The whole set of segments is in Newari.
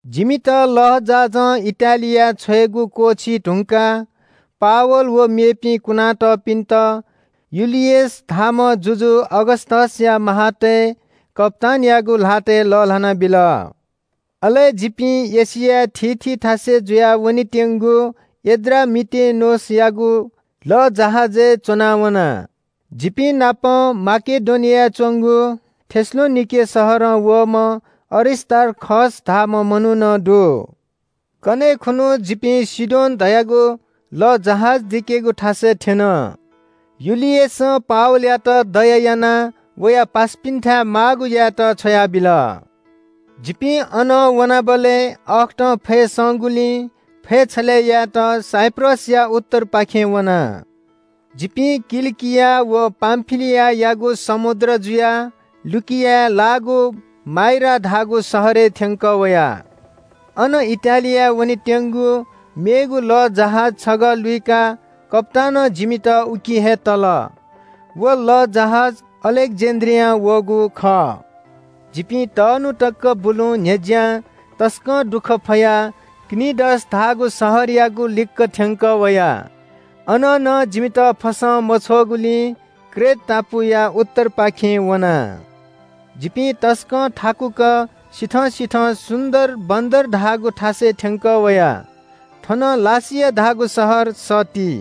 जिमित लःजहाजं इटालियाय् छ्वयेगु क्‍वःछी धुंकाः पावल व मेपिं कुनातःपिन्‍त युलियस धाःम्‍ह जुजु अगस्‍तसया सिपाइँतय् कप्‍तानयागु ल्‍हातय् लःल्‍हाना बिल। अले जिपिं एशियाय् थीथी थासय् जुयाः वनेत्‍यंगु एड्रामिटेनोसयागु लःजहाजय् च्‍वनावना। जिपिं नाप माकेडोनियाय् च्‍वंगु थेसलोनिके शहरं वःम्‍ह अरिस्‍तार्खस धाःम्‍ह मनू नं दु। कन्‍हय् खुन्‍हु जिपिं सीदोन धयागु लःजहाज दिकेगु थासय् थ्‍यन। युलियसं पावलयात दया यानाः वया पासापिन्‍थाय् माःगु यायेत छ्वयाबिल। जिपिं अनं वनाबलय् अःखतं फय् संगुलिं फय् छलय्‌ यायेत साइप्रसया उत्तरपाखें वना। जिपिं किलिकिया व पामफिलियायागु समुद्र जुयाः लुकियाय् लाःगु माइरा धाःगु शहरय् थ्‍यंकः वया। अन इटालियाय् वनेत्‍यंगु मेगु लःजहाज छगः लुइकाः कप्‍तानं जिमित उकी हे तल। व लःजहाज अलेक्‍जेन्‍ड्रियां वःगु खः। जिपिं तःन्‍हु तक बुलुहुँ न्‍ह्यज्‍यां तसकं दुःख फयाः क्‍नीडस धाःगु शहरयागु लिक्‍क थ्‍यंकः वया। अनं नं जिमित फसं मछ्वःगुलिं क्रेट टापुया उत्तरपाखें वना। जिपिं तसकं थाकुक सिथं सिथं सुन्‍दर बन्‍दर धाःगु थासय् थ्‍यंकः वया। थनं लासिया धाःगु शहर सत्ति।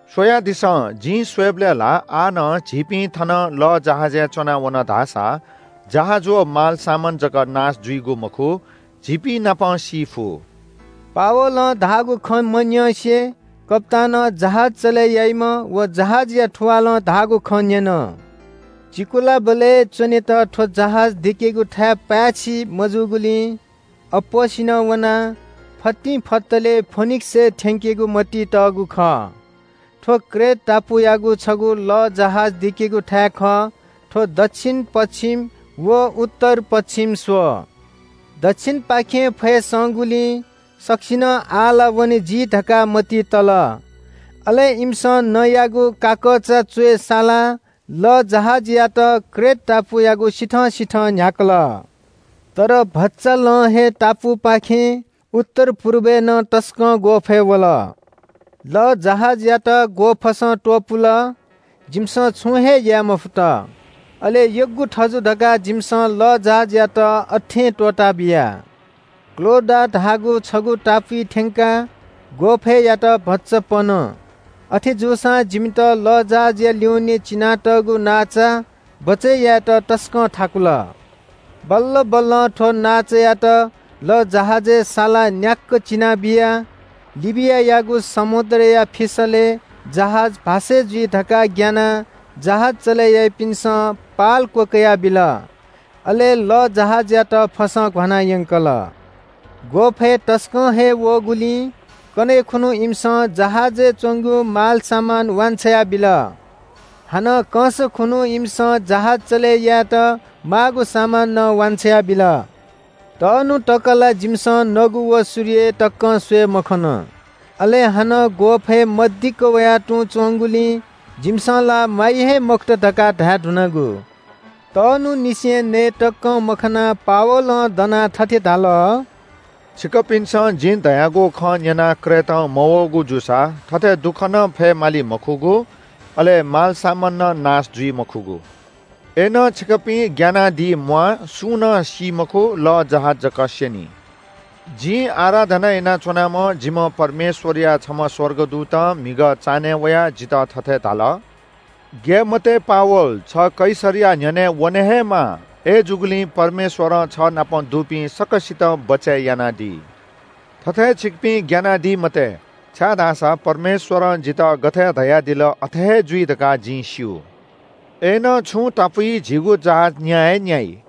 “स्‍वयादिसँ, जिं स्‍वयेबलय् ला आः नं झीपिं थनं लःजहाजय् च्‍वना वन धाःसा जहाज व मालसामान जक नाश जुइगु मखु, झीपिंनापं सी फु।” पावलं धाःगु खँ मन्‍यंसे कप्‍तानं जहाज चले याइम्‍ह व जहाजया थुवालं धाःगु खँ न्‍यन। चिकुलाबलय् च्‍वनेत थ्‍व जहाज दिकेगु थाय् पाय्‌छि मजूगुलिं अप्‍वःसिनं वनाः फतिंफतले फोनिक्‍सय् थ्‍यंकेगु मतिइ तःगु खः। थ्‍व क्रेट टापुयागु छगू लःजहाज दिकेगु थाय् खः। थ्‍व दच्‍छिन-पच्‍छिम व उत्तर-पच्‍छिम स्‍वः। दच्‍छिनपाखें फय् संगुलिं सकसिनं आः ला वने जी धकाः मतिइ तल। अले इमिसं नँयागु काकःचा च्‍वय् सालाः लःजहाजयात क्रेट टापुयागु सिथं सिथं न्‍ह्याकल। तर भचा लं हे टापुपाखें उत्तर पुर्बय् नं तसकं ग्‍वःफय् वल। लःजहाजयात ग्‍वःफसं त्‍वपुल, जिमिसं छुं हे याये मफुत। अले यग्‍गु थजु धकाः जिमिसं लःजहाजयात अथें त्‍वःताबिया। क्‍लौडा धाःगु छगू टापुइ थ्‍यंकाः ग्‍वःफय्‌यात भचा पन। अथेजूसां जिमित लःजहाजया ल्‍युने चिनातःगु नांचा बचय् यायेत तसकं थाकुल। बल्‍ल बल्‍लं थ्‍व नांचायात लःजहाजय् सालाः न्‍याक्‍क चिना बिया। लिबियायागु समुद्रया फिसलय् जहाज भास्‍से जुइ धकाः ग्‍यानाः जहाज चले याइपिन्‍सं पाल क्‍वकयाबिल। अले लःजहाजयात फसं घ्‍वाना यंकल। ग्‍वःफय् तसकं हे वःगुलिं कन्‍हय् खुन्‍हु इमिसं जहाजय् च्‍वंगु मालसामान वान्‍छ्वया बिल। हानं कंस खुन्‍हु इमिसं जहाज चले यायेत माःगु सामान नं वान्‍छ्वया बिल। तःन्‍हु तक ला जिमिसं नगु व सूर्य तकं स्‍वये मखन। अले हानं ग्‍वःफय् मदिक्‍क वया तुं च्‍वंगुलिं जिमिसं ला म्‍वाइ हे मखुत धकाः धाये धुनागु। तःन्‍हुंनिसें नये तकं मखंनाः पावलं दनाः थथे धाल – “छिकपिन्‍सं जिं धयागु खँ न्‍यनाः क्रेटं मवःगु जूसा थथे दुःख नं फयेमाली मखुगु, अले मालसामान नं नाश जुइ मखुगु। अय्‌नं छिकपिं ग्‍यानादी म्‍वाः। सुं नं सी मखु। लःजहाज जक स्‍यनी। जिं आराधना यानाच्‍वनाम्‍ह जिम्‍ह परमेश्‍वरया छम्‍ह स्‍वर्गदूतं म्‍हिगः चान्‍हय् वयाः जितः थथे धाल – ‘ग्‍याये मते पावल, छ कैसरया न्‍ह्यःने वने हे माः। अय्‌जूगुलिं परमेश्‍वरं छ नाप दुपिं सकसितं बचय् यानादी।’ थथे छिकपिं ग्‍यानादी मते, छाय्‌धाःसा परमेश्‍वरं जितः गथे धयादिल अथे हे जुइ धकाः जिं स्‍यू। अय्‌नं छुं टापुइ झीगु जहाज न्‍या हे न्‍याइ।”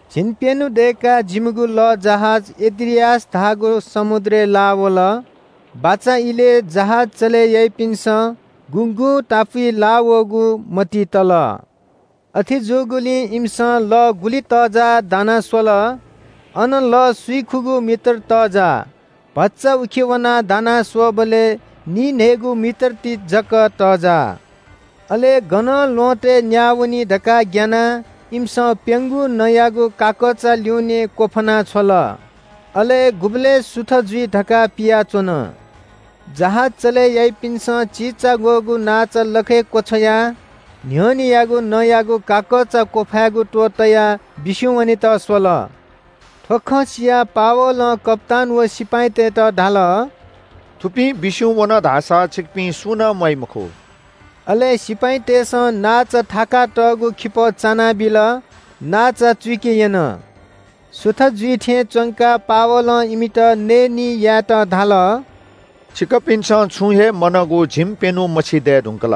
झिंप्‍यन्‍हु दय्‌काः जिमिगु लःजहाज एड्रियास धाःगु समुद्रय् लाः वल। बाचा इलय् जहाज चले याइपिन्‍सं गुगुं टापुइ लाःवःगु मतिइ तल। अथे जूगुलिं इमिसं लः गुलि तःजाः दाना स्‍वल। अन लः स्‍विखुगू मिटर तःजाः। भचा उखे वनाः दाना स्‍वःबलय् निइन्‍हय्‌गू मिटर ति जक तःजाः। अले गनं ल्‍वहँतय् न्‍याः वनी धकाः ग्‍यानाः इमिसं प्‍यंगू नँयागु काकःचा ल्‍यूनें क्‍वफाना छ्वल। अले गुबलय् सुथ जुइ धकाः पियाच्‍वन। जहाज चले याइपिन्‍सं चिचाग्‍वःगु नांचा लखय् क्‍वछ्वयाः न्‍ह्यःनेयागु नँयागु काकःचा क्‍वफायेगु त्‍वहः तयाः बिस्‍युं वनेत स्‍वल। थ्‍व खँ सियाः पावलं कप्‍तान व सिपाइँतय्‌त धाल – “थुपिं बिस्‍युं वन धाःसा छिकपिं सुं नं म्‍वाइ मखु।” अले सिपाइँतय्‌सं नांचा थाकातःगु खिपः चानाबिल। नांचा चुइके यन। सुथ जुइ थें च्‍वंकाः पावलं इमित नयेनी यायेत धाल – “छिकपिन्‍सं छुं हे मनःगु झिंप्‍यन्‍हु मछिं दये धुंकल।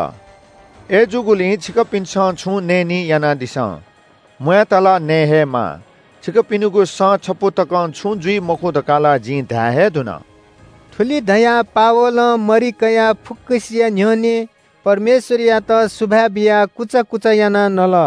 अय्‌जूगुलिं छिकपिन्‍सं छुं नयेनी यानादिसँ। म्‍वायेत ला नये हे माः। छिकपिनिगु सँ छपु तकं छुं जुइ मखु धकाः ला जिं धाये हे धुन।” थुलि धयाः पावलं मरि कयाः फुक्‍कसिया न्‍ह्यःने परमेश्‍वरयात सुभाय् बियाः कुचा कुचा यानाः नल।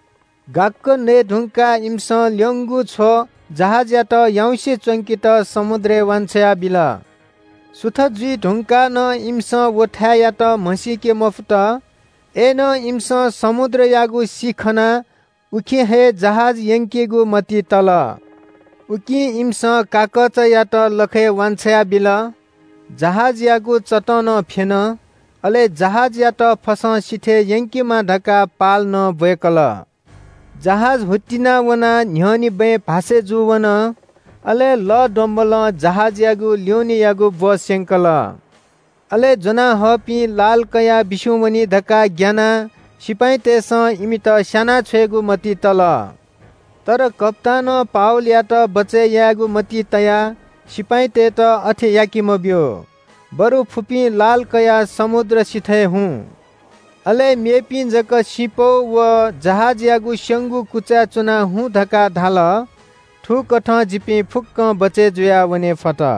गाक्‍क नये धुंकाः इमिसं ल्‍यंगु छ्व जहाजयात याउँसे च्‍वंकेत समुद्रय् वान्‍छ्वया बिल। सुथ जुइ धुंकाः नं इमिसं व थाय्‌यात म्‍हसीके मफुत। अय्‌नं इमिसं समुद्रयागु सि खनाः उखे हे जहाज यंकेगु मतिइ तल। उकिं इमिसं काकःचायात लखय् वान्‍छ्वया बिल, जहाजयागु चतं नं फ्‍यन, अले जहाजयात फसं सिथय् यंकेमा धकाः पाल नं ब्‍वय्‌कल। जहाज हुत्तिना वनाः न्‍ह्यःने बँय् भास्‍से जूवन, अले लः द्वंब्‍वलं जहाजयागु ल्‍यूनेयागु ब्‍व स्‍यंकल। अले ज्‍वनाहःपिं लाल कयाः बिस्‍युं वनी धकाः ग्‍यानाः सिपाइँतय्‌सं इमित स्‍याना छ्वयेगु मतिइ तल। तर कप्‍तानं पावलयात बचय् यायेगु मतिइ तयाः सिपाइँतय्‌त अथे याके मब्‍यू, बरु फुपिं लाल कयाः समुद्र सिथय् हुँ। अले मेपिं जक सिँपौ व जहाजयागु स्‍यंगु कुचाय् च्‍वनाः हुँ धकाः धाल। थुकथं जिपिं फुक्‍कं बचय् जुयाः वने फत।